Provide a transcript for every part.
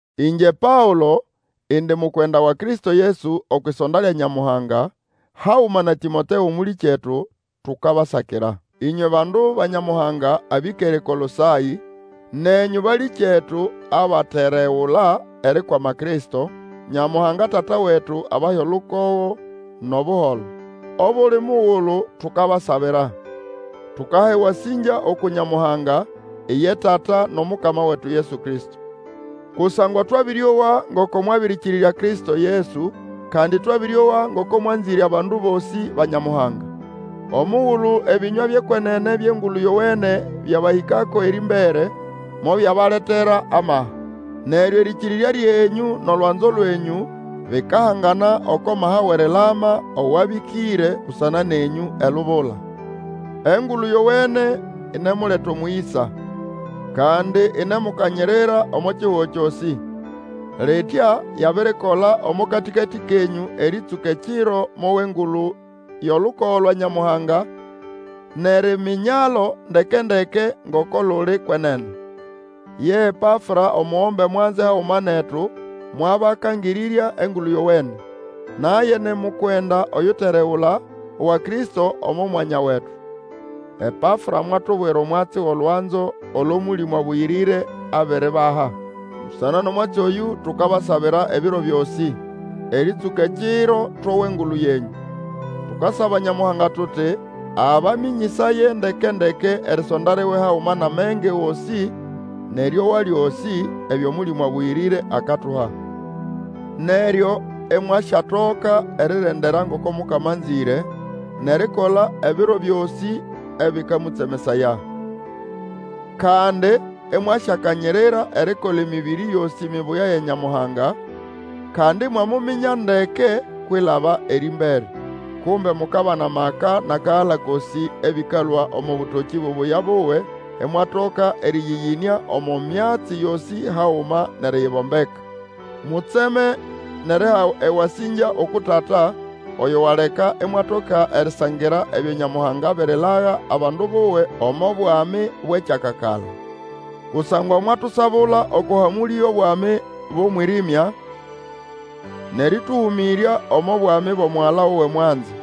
Ĩngye Paũlo, indi mukwenda wa Kristo Yesu okwʼisonda lya Nyamuhanga haguma na Tĩmoteo mũlĩkyetu tukabasakira. Ĩnywe bandu ba Nyamuhanga abĩkere eKolosaĩ, nenyũ balĩkyetu abateregula erikwama Kristo, Nyamuhanga Tata wetu abahe olukogo nʼobuholo. Obuli mugulu tukabasabira, tukaha ewasĩngya uku Nyamuhanga, iye Tata nʼOmukama wetu Yesu Kristo. Kusangwa twabĩrĩowa ngoko mwabĩrĩkĩrĩrya Kristo Yesu, kandi twabĩrĩowa ngoko mwanzĩre abandu bosĩ ba Nyamuhanga. Omugulu ebĩnywa byʼekwenene byʼEngulu Yowene byabahĩkako erĩmbere, mobyabaletera amaha. Neryo erĩkĩrĩrya lyenyũ nʼolwanzo lwenyũ bikahangana oko maha wʼerilama awabĩkĩre busana nenyũ elubula. Engulu Yowene inemuleta omũyĩsa, kandi inemukanyirira omo kihugo kyosĩ. Litya yabirikola omo katĩkatĩ kenyũ erĩtsũka ekiro mowa engulu yʼolukogo lwa Nyamuhanga nʼeriminyalo ndeke-ndeke ngoko luli kwenene. Ye Epafra, omugombe mwanze haguma netu mwabakangĩrĩrya Engulu Yowene. Naye ni mukwenda oyuteregula, wa Kristo omo mwanya wetu. Epafra mwatubwira omwatsi wʼolwanzo olo Mũlĩmũ Abũyĩrĩre abiribaha. Busana nʼomwatsi oyũ, tukabasabira ebiro byosĩ erĩtsũka ekiro towa engulu yenyũ. Tukasaba Nyamuhanga tuti abamĩnyĩsaye ndeke-ndeke erisonda liwe haguma nʼamenge gosĩ nʼerĩowa lyosĩ, ebyo Mũlĩmũ Abũyĩrĩre akatuha. Neryo imwasyatoka eri rendera ngoko Mukama anzĩre, nʼerikola ebiro byosĩ ebĩkamũtsemesaya. Kandi imwasyakanyirira erikola emĩbĩrĩ yosĩ mibuya ya Nyamuhanga, kandi imwamuminya ndeke kwilaba erĩmbere. Kumbe mukabana maka nʼakagala kosĩ ebĩkalũa omo bũtokĩ bubuya buwe, imwatoka erĩyĩyĩnĩa omo myatsi yosĩ haguma nʼeriyibombeka. Mutseme nʼeriha ewasĩngya uku Tata, oyo waleka imwatoka erisangira ebyo Nyamuhanga abirilaga abandu buwe omo bwami bwʼekyakakala. Kusangwa mwatusabula oko hamũlĩ yʼobwami bwʼomwĩrĩmya nʼerĩtũhũmĩrya omo bwami bwʼomugala wuwe mwanze.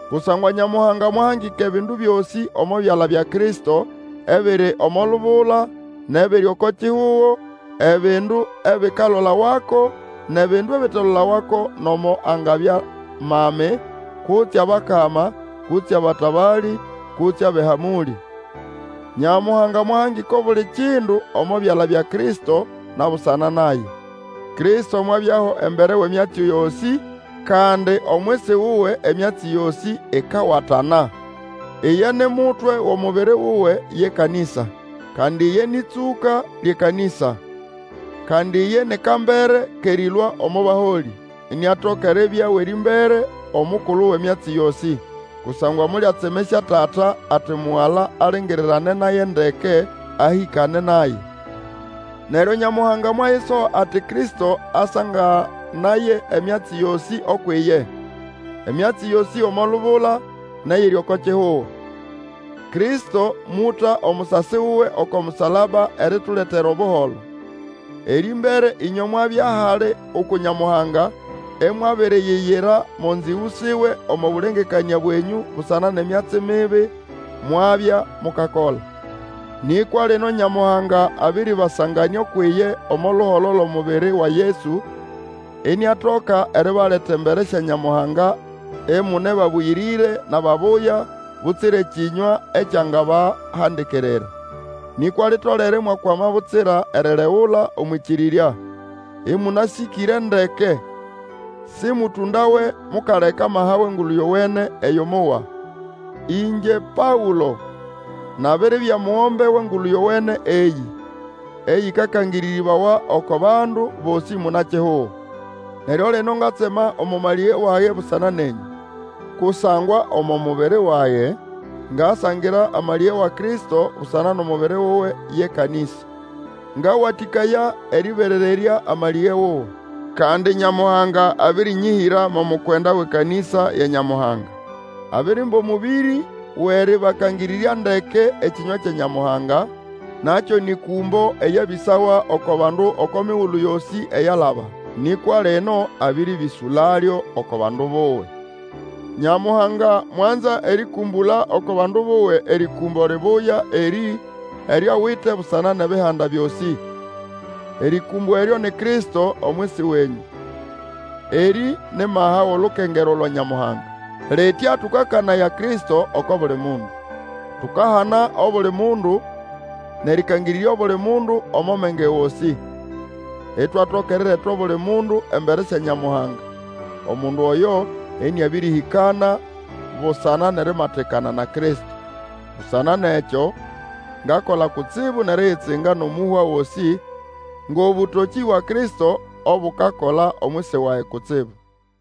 Kusangwa Nyamuhanga mwahangika ebindu byosĩ omo byala bya Kristo, ebiri omo lubula, nʼebiri oko kihugo, ebindu ebikalolawako, nʼebindu ebitelolawako nomo angabya mami, kutse abakama, kutse abatabalĩ, kutse abʼehamũlĩ. Nyamuhanga mwahangika obuli kindu omo byala bya Kristo, na busana naye. Kristo mwabyaho embere wʼemyatsi yosĩ, kandi omwisi wuwe emyatsi yosĩ ikawatana. Iye ni mutwe wʼomubiri wuwe, ye kanĩsa; kandi iye nĩ ʼtsũka lyʼekanĩsa; kandi, iye ni kambere kʼerĩlũa omo baholĩ, iniatoka eribya owʼerĩmbere, omukulu wʼemyatsi yosĩ. Kusangwa molyatsemesya Tata, ati Mugala alingirirane naye ndeke, ahĩkane naye. Neryo Nyamuhanga mwayisoha ati Kristo asanganaye emyatsi yosĩ ukwʼiye, emyatsi yosĩ omo lubula, nʼeyiri oko kihugo. Kristo mũta omusasi wuwe oko musalaba erituletera Obuholo. Erĩmbere ĩnywe mwabya hali uku Nyamuhanga imwabiriyiyira mo nzĩgũ siwe omo bũlengekanĩa bwenyũ busana nʼemyatsi mibi mwabya mukakola. Nĩkwa lino Nyamuhanga abĩrĩbasanganĩa ukwʼiye omo luholo lwʼomubiri wa Yesu, iniatoka eribaleta embere sya Nyamuhanga imune babũyĩrĩre nʼababuya, butsira ekĩnywa ekyangabahandikirira. Nĩkwa litolere imwakwama butsira eriregula omwʼĩkĩrĩrya, ĩmũnasĩkĩre ndeke. Sĩmũtũndawe mukaleka amaha wʼEngulu Yowene eyo mowa. Ĩngye Paũlo nabiribya mugombe wʼEngulu Yowene eyĩ, eyĩkakangĩrĩrĩbawa oko bandu bosĩ muna-kihugo. Neryo lino ngatsema omo malĩge wage busana nenyũ. Kusangwa omo mubiri wage ngasangira amalĩge wa Kristo busana nʼomubiri wuwe ye kanĩsa. Ngawatĩkaya erĩberererya amalĩge wuwe. Kandi Nyamuhanga abĩrĩnyĩhĩra mo mukwenda wʼekanĩsa ya Nyamuhanga. Abirimba omũbĩrĩ wʼerĩbakangĩrĩrya ndeke ekĩnywa kya Nyamuhanga, na kyo nĩ kũmbo eryabĩsawa oko bandu oko migulu yosĩ eyalaba. Nĩkwa lino abĩrĩbĩsũlalyo oko bandu buwe. Nyamuhanga mwanza erĩkũmbũla oko bandu buwe erĩkũmbo libuya erĩ eryo awite busana nʼebihanda byosĩ. Erĩkũmbo eryo ni Kristo omwisi wenyũ; erĩ ni maha wʼolukengerwa lwa Nyamuhanga. Litya tũkakanaya Kristo oko buli mundu. Tukahana obuli mundu, nʼerĩkangĩrĩrya obuli mundu omo menge gosĩ, itwatoka erireta obuli mundu embere sya Nyamuhanga, omundu oyo ĩnĩabĩrĩhĩkana busana nʼerimatikana na Kristo. Busana nʼekyo, ngakola kutsibu nʼeriyitsinga nʼomũhwa gosĩ ngʼobũtokĩ bwa Kristo obukakola omwisi wage kutsibu.